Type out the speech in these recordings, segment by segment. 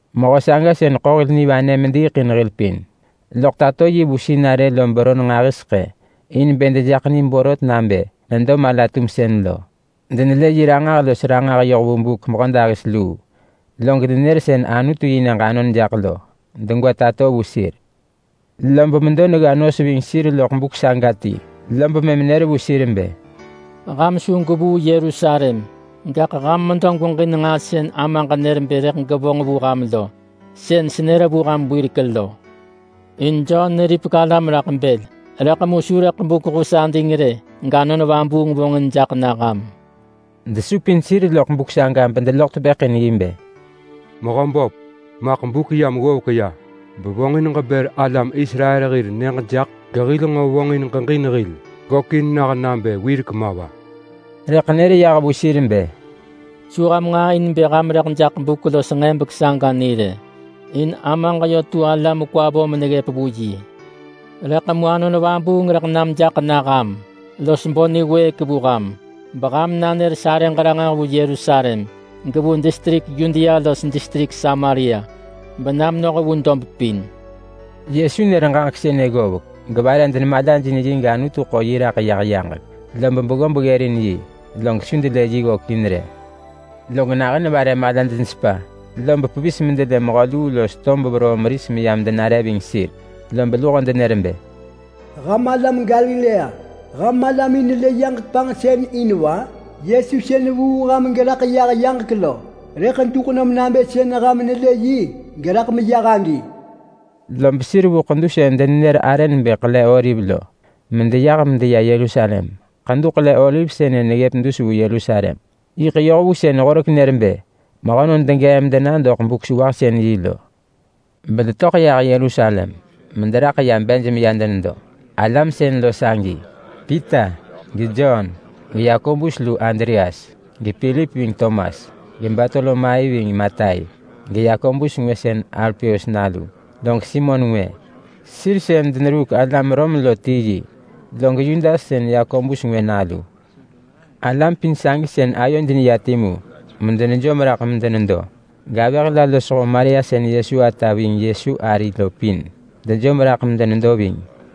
Mehö saga sën ḳo hil nivanë mediiḳ in hil pin, loḳ tato yi vu sinarë lo beron nġahiseḳë in bë dejaḳ ni borot nabë nedo mala-tumsën lo. Denelë yi ranġah los ranġah yoh vu buk mehödahis luu, log nenër sën Anutu-yi-nyëġ anon jaḳ lo degwa tato vu sir. Lob medo negga nos ving sir loḳ buk saga ti, lob mëm nër vu sir bë, “Ham su gwevuu Yerusalem. Gaḳ ham medo gweġin nġaa sën Amaġ nër bë rëḳ gevonġ vu ham lo. Sën senër vu ham wirek lo. In Jon neripek alam raḳ bël, rëḳ su buk hus ading rë gAnon Vabuung vonġin jaḳ na ham.” Loḳ buk saga desupin sir raḳ bedeloḳ tepëḳ in yi bë, “Mehöböp, maḳ buk yam ggovek bevonġin ġebër alam Israel hir nyëġ jaḳ gehil nġo vonġin ġeġin hil gökin nah nabë wirek ma va?” Rëḳ nër yah vu sir bë, “Su ham nġaa in bë ham rëḳ jaḳ buk los nġebek saga ni rë, in Amaġ yö tu ala mekwa vo meneggëp vu yi. Rëḳ mu Anon Vabuung rëḳ nam jaḳ na ham los bo niwëëk vu ham, beham nanër sarëġ ranġah vu Yerusalem, gevu distrik Yudea los distrik Samaria bena menoh vu dob pin.” Yesu nër ġaġek sënë ggovek, gevare denemalajin yi gAnutu ḳo yi raḳ yah yaġek, lob beggob ggërin yi log su delë yi ggökin rë. Log nahën vare malaj nesepa, lob pevis medelë mehö luu los tob veroo meris yam denare ving sir. Lob luho denër bë, “Ham alam Galilea, ham malamin nelë yaġek panġsën in va? Yesu sën vuu ham geraḳ yah yaġek lo rëḳ duḳ nom nabë sën ham nelë yi geraḳ meyah agi!” Lob sir vu ḳedu sën denenër arë nebë Ḳele-oliv lo medeyah medeya Yerusalem. Ḳedu Ḳele-oliv sënë neggëp dus vu Yerusalem yiḳ yoh vu sën horek nër bë mehönon degee medena doḳ Buk-sewahsën-yi lo. Bedetöḳ yah Yerusalem mederaḳ ya bej meya denedo. Alam sën lo sagi: Pita, geJon, geYakobus lu Andreas, gePilip ving Tomas, geBartolomai ving Matai, geYakobus ngwë sën Alpeus nalu, log Simon ngwë sën mehö neruuk alam Rom lo, log Yudas sën Yakobus ngwë nalu. Alam pin sagi sën ayoj timu medenejom raḳ medenedo. Gavëh la losho Maria sën Yesu ata ving Yesu ari lo pin dejom raḳ medenedo ving.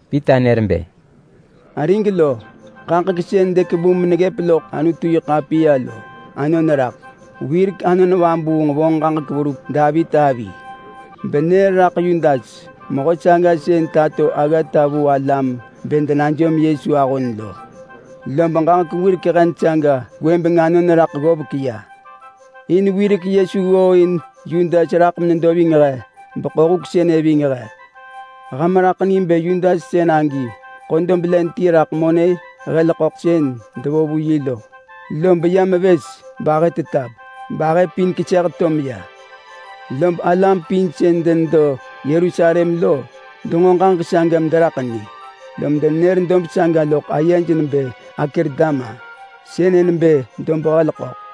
Pita nër bë, “Arig lo, ġaġek sën dekevu meneggëp loḳ Anutu-yi-ḳapiya lo anon raḳ beyiḳ ggovek. Wirek Anon Vabuung vonġ ġaġek verup Davit avi benër raḳ Yudas, mehö saga sën tato aggata vu alam bë denajom Yesu ahon lo, lob ġaġek wirek hen saga gwëbeng anon raḳ ggovek ya. In wirek Yesu ggooin Yudas raḳ menedo ving he beḳo huk sënë ving he. Ham raḳ ni bë Yudas sën agi ḳo dob len ti raḳ monë hel ḳöḳ sën devo vu yi lo, lob ya mevës bahë tetap bahë pin keseh to meya. Lob alam pin sën denedo Yerusalem lo, denġo ġaġek saga mederaḳ ni, lom denenër dob saga loḳ ayej nebë Akeldama. Sënë nebë Dob-hel-ḳöḳ.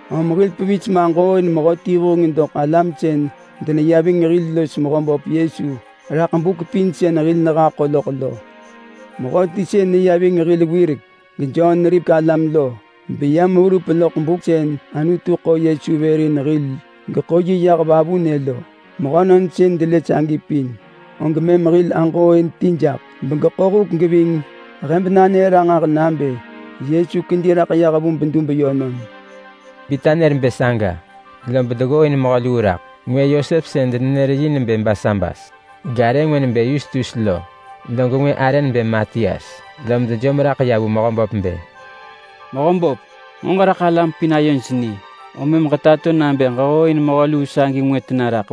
Om hil pevis maġooin mehöti vuheng doḳ alam sën deneya ving hil los Mehöböp Yesu raḳ buk pin sën hil nehaḳo loḳ lo. Mehöti sën neya ving hil wirek geJon neripek alam lo, beyam verup loḳ buk sën Anutu ḳo Yesu vër in hil geḳo yi yah vavunë lo. Mehönon sën delë sagi pin, og mëm hil aġooin ti jaḳ begeḳo huk geving he benanër ranġah nabë Yesu kedi raḳ vu bedub yönon.” Pita nër bë saga, lob deggooin mehö luu raḳ. Ngwë Yosep sën denenër yi nebë Barsabas garë ngwë nebë Yustus lo, log ngwë arë nebë Matias. Lom dejom raḳ vu Mehöböp bë, “Mehöböp, ġeraḳ alam pin ayoj ni, om mëm nġo ġetato vu he nabë ġehooin mehö luu sagi ngwë tena rak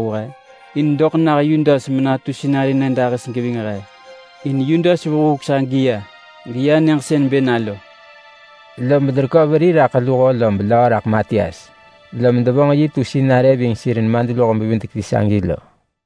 in doḳ nah Yudas ben menatu sinarë nyëdahis geving he. In Yudas vuu huk sagi ya geya nyëġ sën bë na lo.” Lob derekö veri raḳ luho lob löö raḳ Matias, lom devonġ yi tu sinarë ving sir nemadluho-bevidek-ti sagi lo.